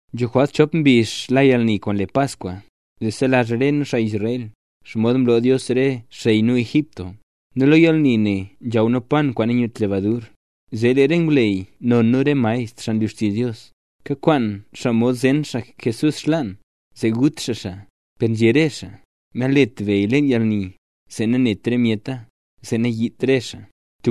Nzho jwalt chop mbizh la yalni kwaan le Paskwa, zee selazh re nu, xaa Israel, xomod mloo Dios re xey nu Egipto, nu lo yalni ne nzhaw nu pan kwaan nanyut lebadur. Zee lee re ngwleyy non nu re maestr, xaa nlu xtizh Dios, kakwaan xaa mod zen xaa Jesús xlaan, zee gut xaa xaa. Per nzhé re xaa: —Nalet beya leen yalni, zee nanet re myeta, zee nanayiit re xaa.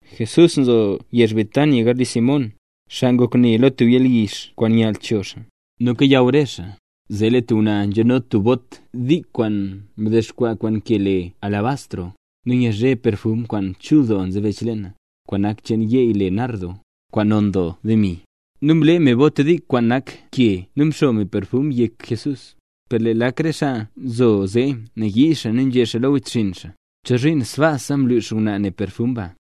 Jesús nzo yezh Betania, garli Simón, xaa ngok ne lo tub yalyizh kwaan nyall cho xaa. Nu kayaw re xaa, zee lee tub ngwnaa nzhano tub bot dik kwaan mdexkwaa kwaan ke le alabastro. Nu nyazhe perfum kwaan chul doo nzebech leena, kwaan nak cheen yeey le nardo, kwaan non gro doo demi. Nu mlee me bot dik kwaan nak ke nu mxo me perfum yek Jesús. Per lee lak re xaa nzo zee nayii xaa, nu nzhé xaa lo wechxinn xaa: —¿Chozhiin sbaasa mlux ngwnaa ne perfum ba?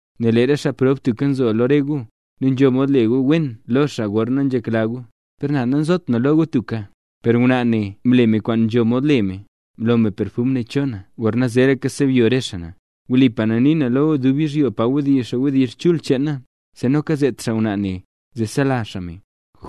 Nel lee re xaa prob tubka nzo lo re gu, nu nzho mod le gu wen lo xaa gorna nzhekla gu, per na, nazot na lo gu tubka. Per ngwnaa ne mle kwaan nzho mod le me, mlo me perfum ne cho na gorna zeeraka sebyo re xaa na. Wlipa na nii na lo gu, dub yizhyo pa wdizh xaa wdizh chul cheen na, zee noka zet xaa ngwnaa ne, zee selazh xaa me.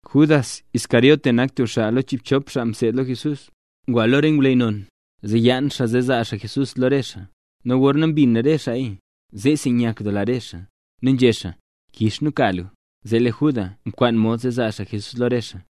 Judas Iscariote nak tub xaa lo chiibchop xaa mseed lo Jesús, ngwa lo re ngwleyy non, zee yaan xaa zee zaa xaa Jesús lo re xaa. Nu gorna mbin re xaaya, zeesi nyakdoola re xaa. Nu nzhé xaa: —Kix nu ka lu. Zee lee Judas mkwaan mod zee zaa xaa Jesús lo re xaa.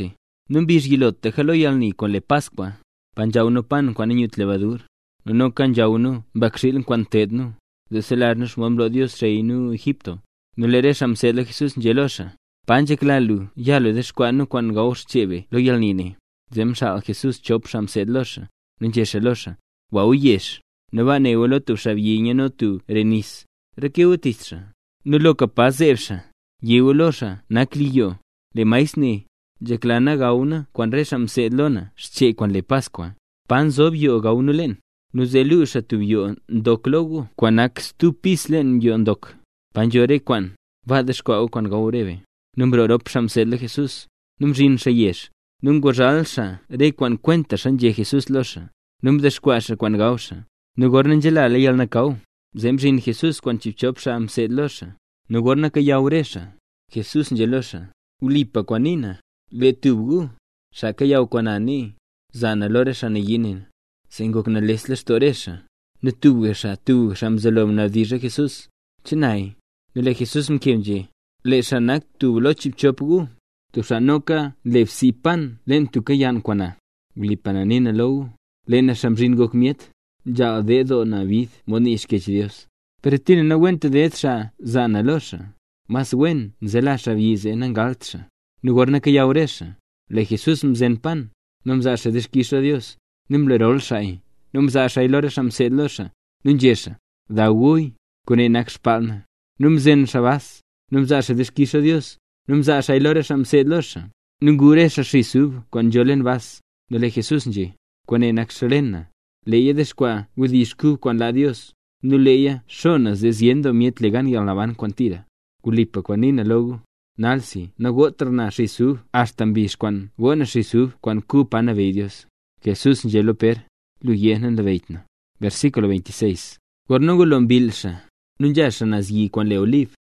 Nu mbizh yilotlaka lo yalni kwaan le Paskwa, pa nzhaw nu pan kwaan nanyut lebadur. Nu noka nzhaw nu mbakxiil kwaan nteed nu, zee nselazh nu xomod mloo Dios xey nu Egipto. Nu lee re xaa mseed lo Jesús nzhé lo xaa: —¿Pa nzhekla lu ya dexkwaa nu kwaan gawxchee be lo yalni ne? Zee mxaal Jesús chop xaa mseed lo xaa, nu nzhé xaa lo xaa: —Gwa gu yezh, nu baa ne gu lo tub xaabyi nyano tub re nis. Reke gu tich xaa. Nu loka pa zeeb xaa, yé gu lo xaa nak li yoo: “Lee Maestr né: ‘Nzhekla na gaw na kwaan re xaa mseed lo na xchee kwaan le Paskwa. ¿Pa nzob yoo gaw nu leen?’” Nu zee luu xaa tub yoo ndok lo gu kwaan nak stub pis leen yoo ndok, pa nzho rese kwaan. Baa dexkwaa gu kwaan gaw re be. Nu mroo rop xaa mseed lo Jesús. Nu mzhin xaa yezh. Nu nguzhal xaa re kwaan kwentaxa nzhé Jesús lo xaa, nu mdexkwaa xaa kwaan gaw xaa. Nu gorna nzelala yalnakaw, zee mzhin Jesús kwaan chiibchop xaa mseed lo xaa. Nu gorna kayaw re xaa, Jesús nzhé lo xaa: —Wlipa kwaan nii na. Lee tub gu, xaa kayaw kwaan na nee, zaa na lo re xaa nayii ne na. Zee ngok nales lextoo re xaa, nu tubga xaa tubga xaa mzelo nabdizh lo Jesús: —¿Che naya? Nu lee Jesús mkeb nzhé: —Lee xaa nak tub lo chiibchop gu, tub xaa noka nle bsii pan leen tubka yann kwaan na. Wlipa na nii na lo gu, lee na Xaa Mzhin Ngok Myet, nzhaal ded doo bid mod nii Xkyech Dios. Per tira nawent ded xaa zaa na lo re xaa. Mas wen nzela xaabyi zee nangalt xaa. Nu gorna kayaw re xaa, lee Jesús mzen pan, nu mzaa xaa dixkix lo Dios, nu mlerol xaaya, nu mzaa xaaya lo re xaa mseed lo xaa. Nu nzhé xaa: —Daw guya, kwaane nak xbaal na. Nu mzen xaa bas. Nu mzaa xaa dixkix lo Dios, nu mzaa xaaya lo re xaa mseed lo xaa, nu ngu re xaa nis kwaan nzho leen bas. Nu lee Jesús nzhé: —Kwaane nak xren na. Leeya dexkwaa wdizh kub kwaan laa Dios, nu leeya xo na zee zyen doo myet le gan yalnaban kwaan tira. Wlipa kwaan nii na lo gu, nalsi nagotra na xis ub axta mbizh kwaana go na xis ub kwaan kub pa nabeyy Dios. Jesús nzhé lo Pér: “Lu yé, nanlabeyyt lu na” Gorna ngulo mbill xaa, nu nzha xaa naz yi kwaan le Olib.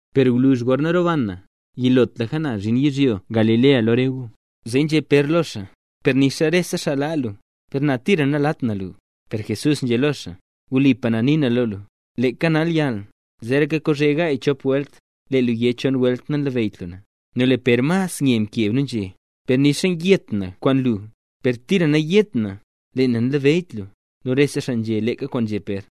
Per gwluzh gorna roban na, yilotlaka na zhin yizhyo Galilea lo re gu. Zee nzhé Pér lo xaa: —¡Per nixa rese xaa laa lu, per na tira nalaat na lu! Per Jesús nzhé lo xaa: —Wlipa na nii na lo lu, leeka nalyall, zeeraka kozhe gaay chop welt, lee lu yé chon welt, nanlabeyyt lu na. Nu lee Pér mas nye mkeb, nu nzhé: —Per nixa yet na kwaan lu, per tira nayét na: “Lee na nanlabeyyt lu”. Nu rese xaa nzhé leeka kwaan nzhé Pér.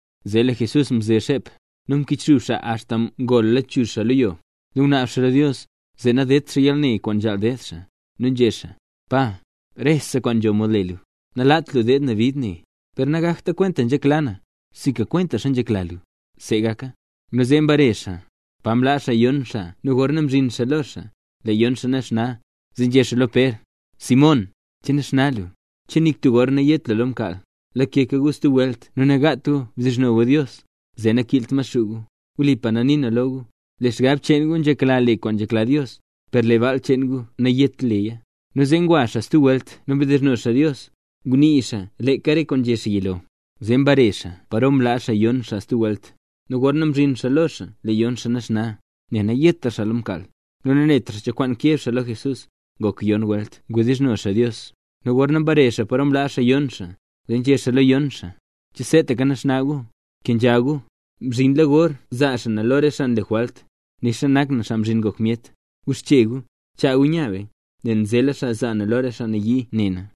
Zee lee Jesús mze xep. Nu mkichxub xaa axta ngol lachuzh xaa lo yo. Nu ngunaab xaa lo Dios, zee nadedt xaa yalne kwaan nzhaal ded xaa. Nu nzhé xaa: —¡Pa! Rese kwaan nzho mod le lu. Nalaat lu deed na bid ne, per nagakta kwentaxa nzhekla na, sinka kwentaxa nzhekla lu. See gaka. Nu zee mbare xaa, pa mlaa xaa yon xaa nu gorna mzhin xaa lo xaa; lee yon xaa naxna. Zee nzhé xaa lo Pér: —Simón, ¿che naxna lu? ¿Che nik tub gor nayet lu lo mkaal? Lakeka gu stub welt nu nagaat gu bdizhno gu Dios, zee nakiilt Maxuu gu. Wlipa na nii na lo gu, lee xgab cheen gu nzhekla le kwaan nzhekla Dios, per lee baal cheen gu nayet leya. Nu zee ngwa xaa stub welt nu mdizhno xaa Dios. Ngunii xaa leeka re kwaan nzhé xaa yilo. Zee mbare xaa paro mlaa xaa yon xaa stub welt, nu gorna mzhin xaa lo xaa lee yon xaa naxna, nel nayetra xaa lo mkaal. Nu nanetra xaa cho kwaan keb xaa lo Jesús. Ngok yon welt ngwawdizhno xaa Dios, nu gorna mbare xaa paro mlaa xaa yon xaa, zee nzhé xaa lo yon xaa: —¿Che seetaka naxna gu? ¡Kenzha gu! Mzhinla gor zaa xaa na lo re xaa mle jwalt, nixa na nak Xaa Mzhin Ngok Myet. Guxche gu, chaa gu nya be, nel nzela xaa zaa na lo re xaa nayii ne na.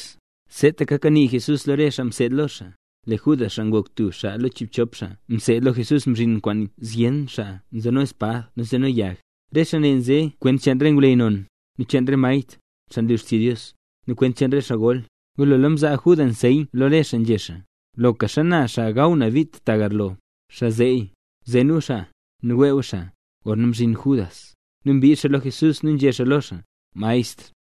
Seetaka kanii Jesús lo re xaa mseed lo xaa, lee Judas, xaa ngok tub xaa lo chiibchop xaa mseed lo Jesús, mzhin kwaan zyen doo xaa nzeno espad nu nzeno yag. Re xaa ne nze kwent cheen re ngwleyy non, nu cheen re maestr, xaa nlu xtizh Dios, nu kwent cheen re xaa gol. Ngulola mzaa Judas nseyn lo re xaa, nzhé xaa: —Loka xana xaa gaw na bit tagarlo, xaa zeeya; zen gu xaa, nu wee gu xaa. Gorna mzhin Judas, nu mbii xaa lo Jesús nu nzhé xaa lo xaa: —Maestr.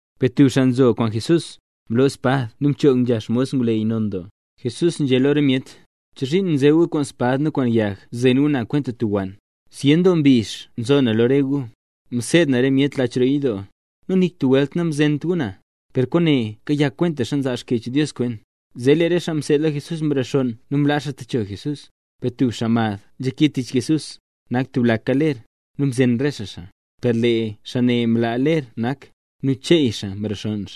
Per tub xaa nzo kwaan Jesús, mloo espad nu mchoog nzha xmos ngwleyy non doo. Jesús nzhé lo re myet: —¿Chozhiin nze gu kwaan spad nu kwaan yag zen gu na kwenta tub wann? Zyen doo mbizh mzo na lo re gu, mseed na re myet lach roo yidoo. Nu nik tub welt namzent gu na. Per kwaane kayak kwentaxa nzaa Xkyech Dios kwent. Zee lee re xaa mseed lo Jesús mrexonn nu mlaa xaa techo Jesús. Per tub xaa mad nzhake tich Jesús, nak xaa tublaka ler, nu mzen re xaa xaa. Per lee xaa ne mlaa ler nak, nu cheey xaa mrexonn.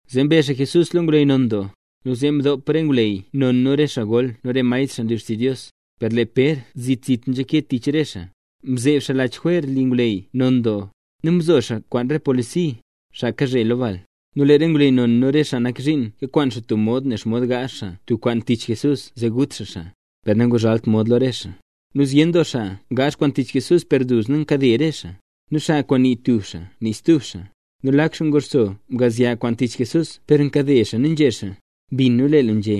Zee mbe xaa Jesús lo ngwleyy non doo, nu zee mdop re ngwleyy non nu re xaa gol nu re maestr xaa nlu xtizh Dios. Per lee Pér zit zit nzhake tich re xaa, mzeeb xaa lach jwer li ngwleyy non doo. Nu mzo xaa kwaan re polisi, xaa kazhe lo bal. Nu lee re ngwleyy non, nu re xaa nak zhiin kakwaan xaa tub mod ne xomod gaazh xaa tub kwaan tich Jesús zee gut xaa xaa, per nanguzhalt mod lo re xaa. Nu zyen doo xaa ngaazh kwaan tich Jesús per duzna nkade re xaa, nu xa kwaan nii tub xaa nii stub xaa. Nu lak xaa nguxso mgaazh kwaan tich Jesús per nkade xaa nu nzhé xaa: —Mbin nu lee lu nzhé: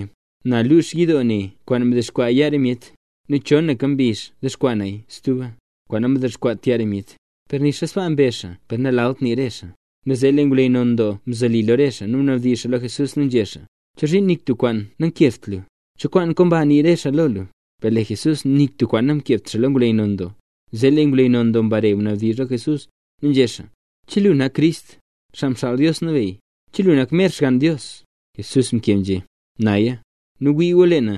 “Na lux yidoo ne kwaan mdexkwaa yaa re myet, nu chonaka mbizh dexkwaa naya stuba, kwaan nadexkwaat yaa re myet”. Per nixa sbaa mbezh xaa per nalalt nii re xaa. Nu zee lee ngwleyy non doo mzoli lo re xaa, nu mnabdizh lo Jesús nu nzhé: —¿Chozhiin nik tub kwaan namkebt lu? ¿Cho kwaan komba nii re xaa lo lu? Per lee Jesús nik tub kwaan namkebt lo ngwleyy non doo. Zee lee ngwleyy non doo mbare mnabdizh lo Jesús, nu nzhé xaa: —¿Che lu nak Crist, Xaa Mxaal Dios Nabeyy? ¿Che lu nak mer Xgann Dios? Jesús mkeb nzhé: —Naya. Nu wii gu lee na,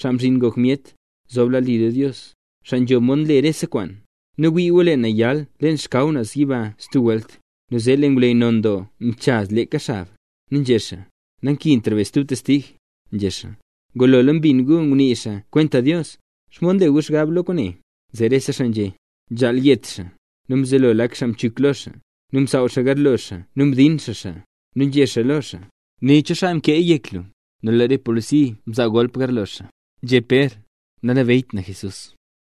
Xaa Mzhin Ngok Myet, zob lad li lo Dios, xaa nzho mod nle rese kwaan. Nu wii gu, lee na yal leen xkaw naz yiba stub welt. Nu zee lee ngwleyy non doo mchaz leeka xab, nu nzhé xaa: —¡Nankintra be stub testig! —nzhé xaa—. ¡Ngulola mbin gu ngunii xaa kwenta Dios! ¿Xomod nle gu xgab lo kwaane? Zee rese xaa nzhé: —¡Nzhaal yet xaa! Nu mzelo lak xaa mchuk lo xaa, nu msaaw xaa garlo xaa nu mdin xaa xaa. Nu nzhé xaa lo xaa: —¡Né, cho xaa mkee yek lu! Nu lee re polisi mzaa golp garlo xaa. Nzhé Pér: “Nanlabeyyt na Jesús”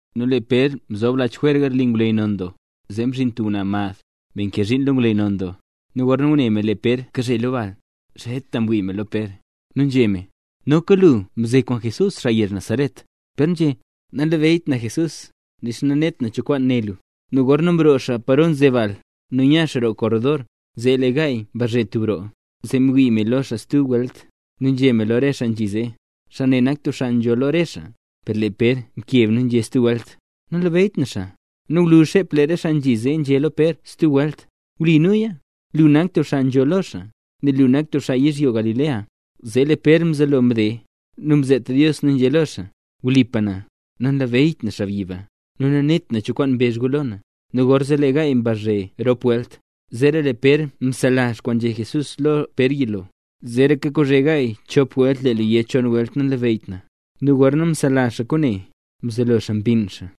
Nu lee Pér mzob lach jwer garli ngwleyy non doo, zee mzhin tub ngwnaa mad, me nkee zhiin lo ngwleyy non doo. Nu gorna ngune me lee Pér kazhe lo bal, zheta mwii me lo Pér, nu nzhé me: —Noka lu mze kwaan Jesús, xaa yezh le Nazaret. Pér nzhé: —Nanlabeyyt na Jesús, nixa nanet na cho kwaan né lu. Nu gorzee mroo xaa paro nze bal, nu mya xaa roo korredor, zee lee gaay mbazhe tub roo. Zee mwii me lo xaa stub welt, nu nzhé me lo re xaa nzhi zee: —Me nee nak tub me nzho lo re me. Per lee Pér mkeb nu nzhé stub welt: —Nanlabeyyt na xaa. Nu gwluzh xep lee re xaa nzhi zee nzhé lo Pér stub welt: —Wli nuya. Lu nak tub xaa nzho lo xaa, nel lu nak tub xaa yizhyo Galilea. Zee lee Pér mzelo mde, nu mzet Dios nu nzhé lo re xaa: —¡Wlipa na, nanlabeyyt na xaabyi ba! ¡Nu nanet na cho kwaan mbezh gu lo na! Nu gorzee lee gaay mbazhe rop welt. Zeera lee Pér mselazh kwaana nzhé Jesús lo Pér yilo: “Zeeraka kozhe gaay chop welt lee lu yé chon welt nanlabeyyt na”. Nu gorna mselazh xaa kwaane, mzelo xaa mbinn xaa.